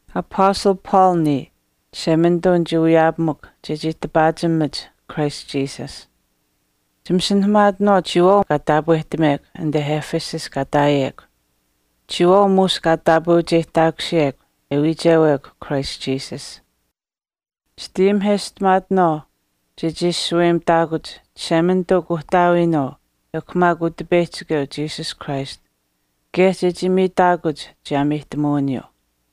Apastal Paul niya, Chishemanituu nichii wiyaapamukw chechii tipaachimach Christ Jesus. Chimasinahamaatinaawaau chiyawaau kaa taapwehtamekw anite Ephesus kaa ihtaayekw, chiyawaau muush kaa taapweucheyihtaakusiyekw e wiichewekw Christ Jesus. Chitayimiheshtamaatinaawaau chechii shaweyimitaakuch Chishemanituu Kuuhtaawiinuu ekw maak Utipeyihchikeu Jesus Christ kaye chechii miitaakuch chiyaameyihtamuwiniyuu.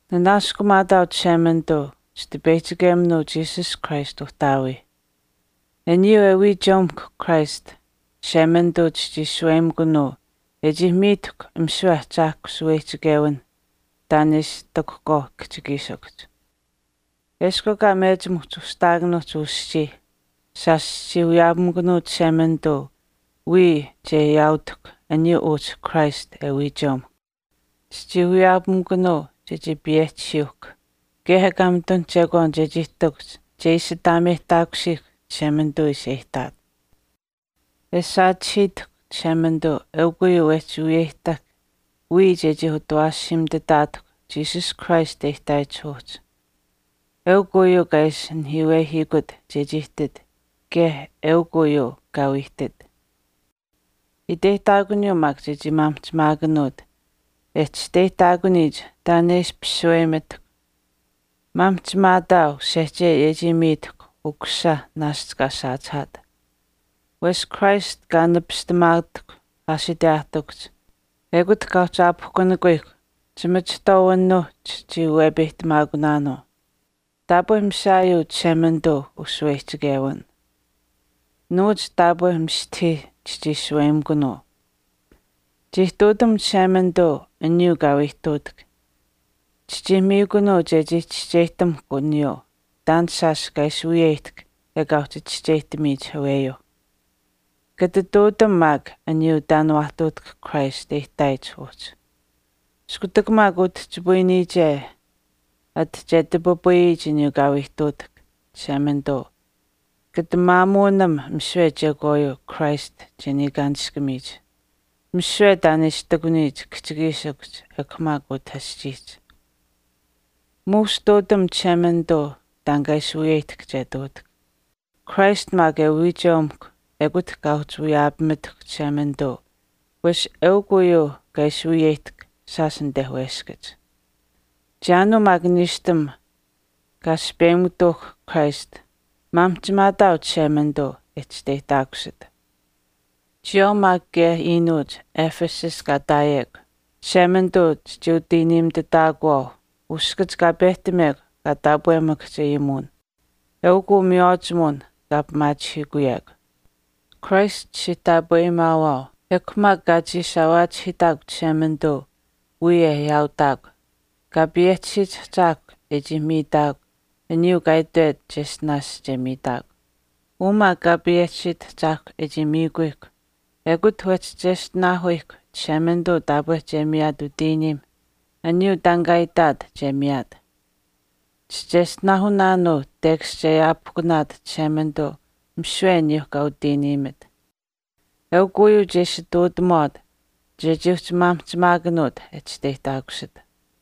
Nanaaskumaataau Chishemanituu, Chitipeyihchikeminuu Jesus Christ Uhtaawii. Aniyuu e wiicheumihkw Christ, Chishemanituu chichii shaweyimikunuu e chii miitahkw misiwe ahchaahkw shaweyihchichewinh taan e ishi ihtakuhkwaauh kihchikiishikuhch. Eshkw ekaa mechim uhchi ushihtaakanuuhch uu aschii, shaash chichii wiyaapamikunuu Chishemanituu wiya che ayaautihkw aniyuu uhchi Christ e wiicheumuhkw. Chichii wiyaapamikunuu chechii payehchisiyuuhkw kaye ekaa mitun chekwaan chechii ihtakuhch che ishi ataameyihtaakusiihkw Chishemanituu ishi e ihtaat. E saachihiitahkw Chishemanituu eukw uyuu wehchii wiyeyimitahkw wiya chechii utawaashiimituutaatahkw Jesus Christ e ihtaayich uhchi. Eukw uyuu kaa ishi naheyihtamihiikut chechii ihtit kaye eukw uyuu kaa wii ihtit. Iteyihtaakuniyuu maak chechii maamihchimaakanuut e chisteyihtaakuniyich taan e ishpish shaweyimitahkw. Maamihchimaataau sehchei e chii miitahkw Ukusisa naashch kaa saachihaat. Wesh Christ kaa nipistamaatahkw aashiteyaahtikuhch, ekut kaa uhchi aapihkunikuyihkw, chimachihtwaawinuuh chichii wepeyihtamaakunaanuu. Taapwe mishaayuu Chishemanituu ushaweyihchichewin. Nuwach taapwe mistahii chichii shaweyimikunuu. Chii ihtuutam Chishemanituu aniyuu kaa wii ihtuutahk, chichii miikunuu chechii chischeyihtamuhkw aniyuu taan shaash kaa ishi wiyeyihtahk ekaa uhchi chischeyihtamiyich aweyuuh. Kata ihtuutam maak aniyuu taan waa ihtuutahk Christ e ihtaayich uhchi. Iskutak maak utihchipayiniyiche anit che tipipayiniyich aniyuu kaa wii ihtuutahk Chishemanituu kata maamuunam misiwe chekwaayuu Christ che niikaanishkamiyich, misiwe taan e ishi ihtakuniyich kihchikiishikuhch ekw maak utah aschiihch. Muush ihtuutam Chishemanituu taan kaa ishi wiyeyihtahk che ihtuutahk. Christ maak e wiicheumuhkw ekut kaa uhchi wiyaapamitahkw Chishemanituu wesh eukw uyuu kaa ishi wiyeyihtahk shaash anite weskach. Chiyaanuu maak niishtam kaa aspeyimutuuhkw Christ, maamihchimaataau Chishemanituu e chisteyihtaakusit. Chiyawaau maak kaye anite Ephesus kaa ihtaayekw, Chishemanituu chichii utiiniimitutaakuwaau uskach kaa pehtamekw an kaa taapwemakahch ayimuwin, eukuu miywaachimuwin kaa pimaachihiikuyekw. Christ chichii taapweyimaawaau, ekw maak kaa chiishaawaachihiitaakw Chishemanituu wiya e ayaautaakw, Kaa payehchisiyich Ahchaahkwa e chii miitaakw aniyuu kaa itwet cheshtinaash che miiwet. Uu maak Kaa payehchisiit Ahchaahkw e chii miikuyihkw ekut wehchi cheshtinaahuyihkw Chishemanituu taapwe che miyaat utiiniim aniyuu taan kaa itaat che miyaat. Chicheshtinaahunaanuu tekash che aapihkunaat Chishemanituu misiwe aniyuu kaa utiiniimit. Eukw uyuu che ishi ihtuutamuwaat chechii uhchi maamihchimaakanuut e chisteyihtaakusit.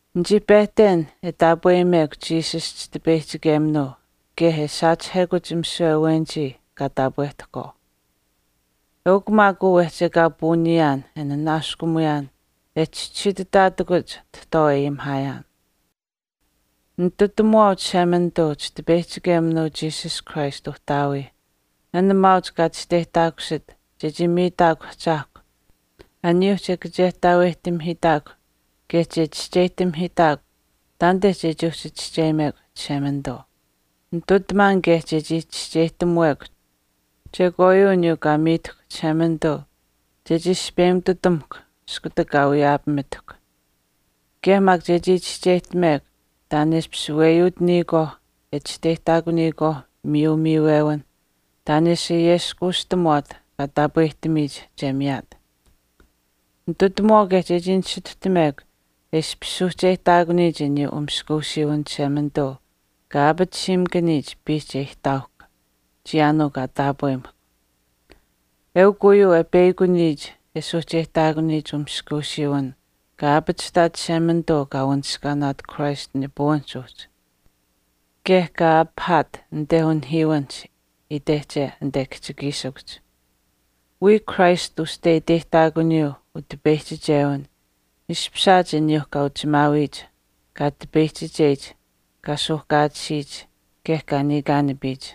Nichii pehten e taapweyimekw Jesus chitipeyihchikeminuu kaye e saachihekuch misiwe awenich kaa taapwehtahkwaau. Eukw maak uu wehchi ekaa puuniyaan e nanaaskumuyaan e chischisiitutaatakuch tahtwaau e ayimihaayaan. Ninitutamuwaau Chishemanituu Chitipeyihchikeminuu Jesus Christ Uhtaawii an maauch kaa chisteyihtaakusit chechii miitaakw Utahchaahkwa aniyuuh che kachehtaaweyihtamihiitaakw kaye che chischeyihtamihiitaakw taanite chechii uhchi chischeyimekw Chishemanituu. Ninitutamaan kaye chechii chischeyihtamuwekw chekwaayuu aniyuu kaa miitahkw Chishemanituu chechii aspeyimututamuhkw iskutak kaa wiyaapamitahkw. Kaye maak chechii chischeyihtamekw taan e ishpish weyuutaniyikwaauh e chisteyihtaakuniyikwaauh miyu miiwewinh taan e ishi ayeskuushtamuwaat kaa taapwehtamiyich che miyaat. Nitutamuwaau kaye chechii nisituhtamekw e ishpish suuhcheyihtaakuniyich aniyuu umaskuusiiwin Chishemanituu kaa aapatisiimakaniyich piihch e ihtaauhkw, chiyaanuu kaa taapwehtamukw. Eukw uyuu e peyakuniyich e suuhcheyihtaakuniyich maskuusiiwiniyuu kaa aapachihtaat Chishemanituu kaa wanishkaanaat Christ nipuwinihch uhchi kaye kaa apihaat anite unihiiwinihch itehche anite kihchikiishikuhch. Wiya Christ uste iteyihtaakuniyuu utipeyichichewin ishpishaat aniyuuh kaa uchimaawiyich, kaa tipeyihchicheyich, kaa suuhkaatisiyich, kaye kaa niikaanipiyich.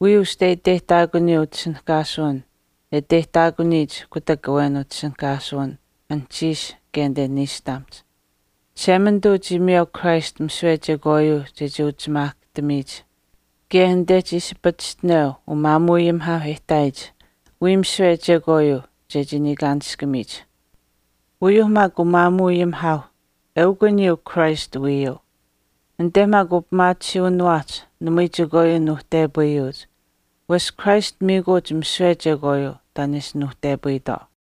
Wiya uste iteyihtaakuniyuu utishinihkaasuwin e iteyihtaakuniyich kutak awen utishinihkaasuwin anuhchiish kaye anite niishtamihch. Chishemanituu chii miyeu Christ misiwe chekwaayuu chechii uchimaahkahtamiyich kaye anite chii ishi pachishtineu umaamuuayimihaauh e ihtaayitwaauh wiya misiwe chekwaayuu chechii niikaanishkamiyich. Uyuuh maak umaamuuayimihaauh, eukw aniyuu Christ wiiyuu. Anite maak upimaatisiiwiniwaahch namui chekwaayuu nuuhtepayuuch wesh Christ miikuuch misiwe chekwaayuu taan e ishi nuuhtepayitwaau.